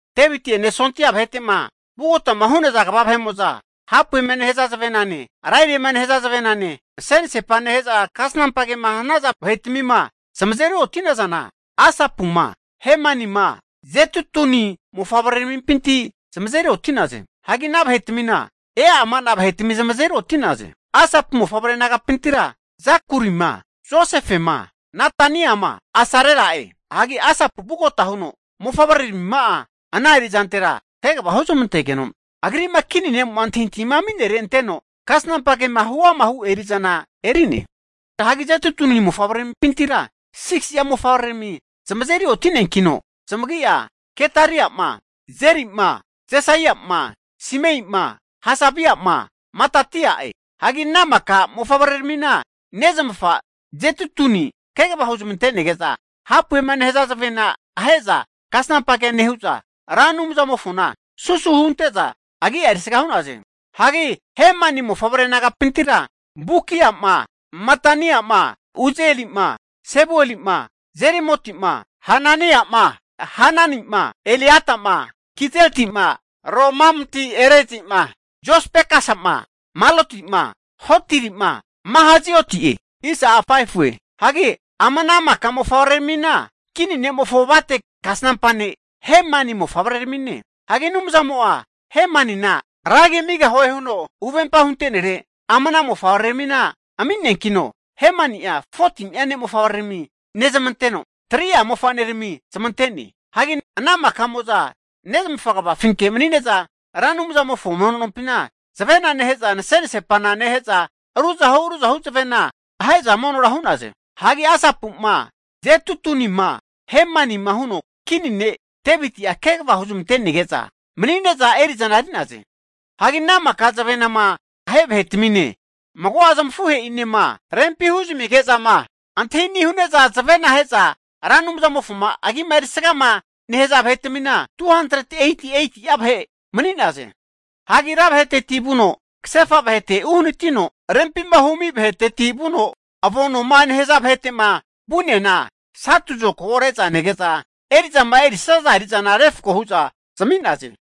Deviti'ene sondia vahete'ma vugotama hu'naza kva vahe'mo'za hapuema nehaza zavenane, lariema nehaza zavenane, nase'nasepa nehe'za kasnampa kema hanaza vahetmima zamazeri oti'nazana, Asapuma, Hemanima Jedutuni mofavreramimpinti zamazeri oti'naze. Hagi ana vahetmina ama vahetami zamazeri oti'naze, Asapu mofavre nagapintira Zakurima, Josefema, Netaniama, Asarela'e. Hagi Asapu vugota huno mofavreramima'a ana erizantera kegava huzmantegeno, agri'ma kini ne'mo'ma antahintahima ami'nere anteno kasnampa kema huama hu eri'zana eri'ne. Hagi Jedutuni mofavreramimpintira 6si'a mofavrerami zamazeri oti'neankino zamagi'a Gedaria'ma, Zeri'ma, Jesaia'ma, Simei'ma, Hasabia'ma, Matitia'e. Hagi ana maka mofavreramina nezmafa Jedutuni kegava huzmante'nege'za, hapuema nehaza zavena ahe'za kasnampa kea nehu'za, Ra Anumzamofona susu hunte'za agia erisga hu'naze. Hagi Hemani mofavre nagapintira, Bukiama, Mataniama, Uzielima, Sebuelima, Jerimotima, Hananiama, Hananima, Eliatama, Gidaltima, Romamti-Ezerima, Josbekasama, Malotima, Hotirima, Mahazioti'e. Hagi ama ana maka mofavreramina kini nemofo avate kasnampa ne' Hemani mofavreramine. Hagi Anumzamo'a Hemanina ragi amigahue huno huvempa hunte'nere ama ana mofavreramina ami'neankino, Hemani'a 14ni'a ne' mofavrerami nezmanteno, 3'a mofanerami zamante'ne. Hagi ana makamo'za nezmafa kavafinke mani'ne'za Ra Anumzamofo mono nompina zavena neheza nase'nasepana nehe'za ruzahu ruzahu zavena ahe'za monora hu'naze. Hagi Asapuma, Jedutunima, Hemanima huno kini ne' Deviti'a kegava huzmantenege'za mani'ne'za eri'zana eri'naze. Hagi ana maka zavenama ahe vahetamine, mago'a zamafuhe'inema zavenama ahe'zama rempi huzamige'zama antahini' hu'ne'za zavenama ahe'za Ra Anumzamofoma agima erisgama nehaza vahetmina, 288'a vahe mani'naze. Hagi ra vaheteti vuno kasefa vahete uhanatino, rempima humi vaheteti vuno avo noma nehaza vahete'ma vu'neana satu zokago re'za nege'za eri'zama erisaza eri'zana refko hu'za zami'naze.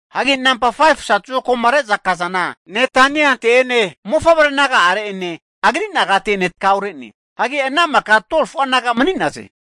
Hagi namba 5fu satu zokagoma re'za kazana Netaniante'ene, mofavre naga'are'ene agri nagate'ene takaure'ne. Hagi ana maka 12fu'a naga mani'naze.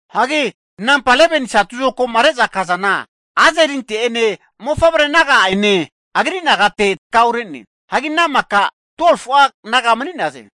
Hagi namba 11ni satu zokagoma reza kazana Azarelinte'ene, mofavre naga'are'ene agri nagate'ene takaure'ne. Hagi ana maka 12fu'a naga mani'naze.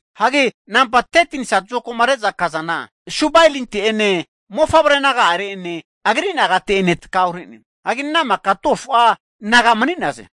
Hagi namba 13ni satu zokagoma reza kazana Subaelinte'ene, mofavre naga'are'ene agri nagate'ene takaure'ne. Hagi ana maka 12fu'a naga mani'naze.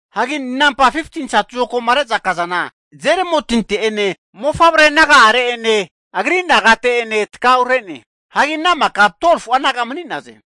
Hagi namba 15ni satu zokagoma reza kazana Jeremotinte'ene, mofavre naga'are'ene agri nagate'ene takaure'ne. Hagi ana maka 12fu'a naga mani'naze.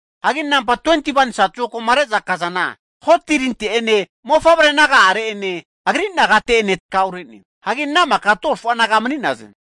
Hagi namba 21ni satu zokagoma reza kazana Hotirinte'ene, mofavre naga'are'ene agri nagate'ene takaure'ne. Hagi ana maka 12fu'a naga mani'naze.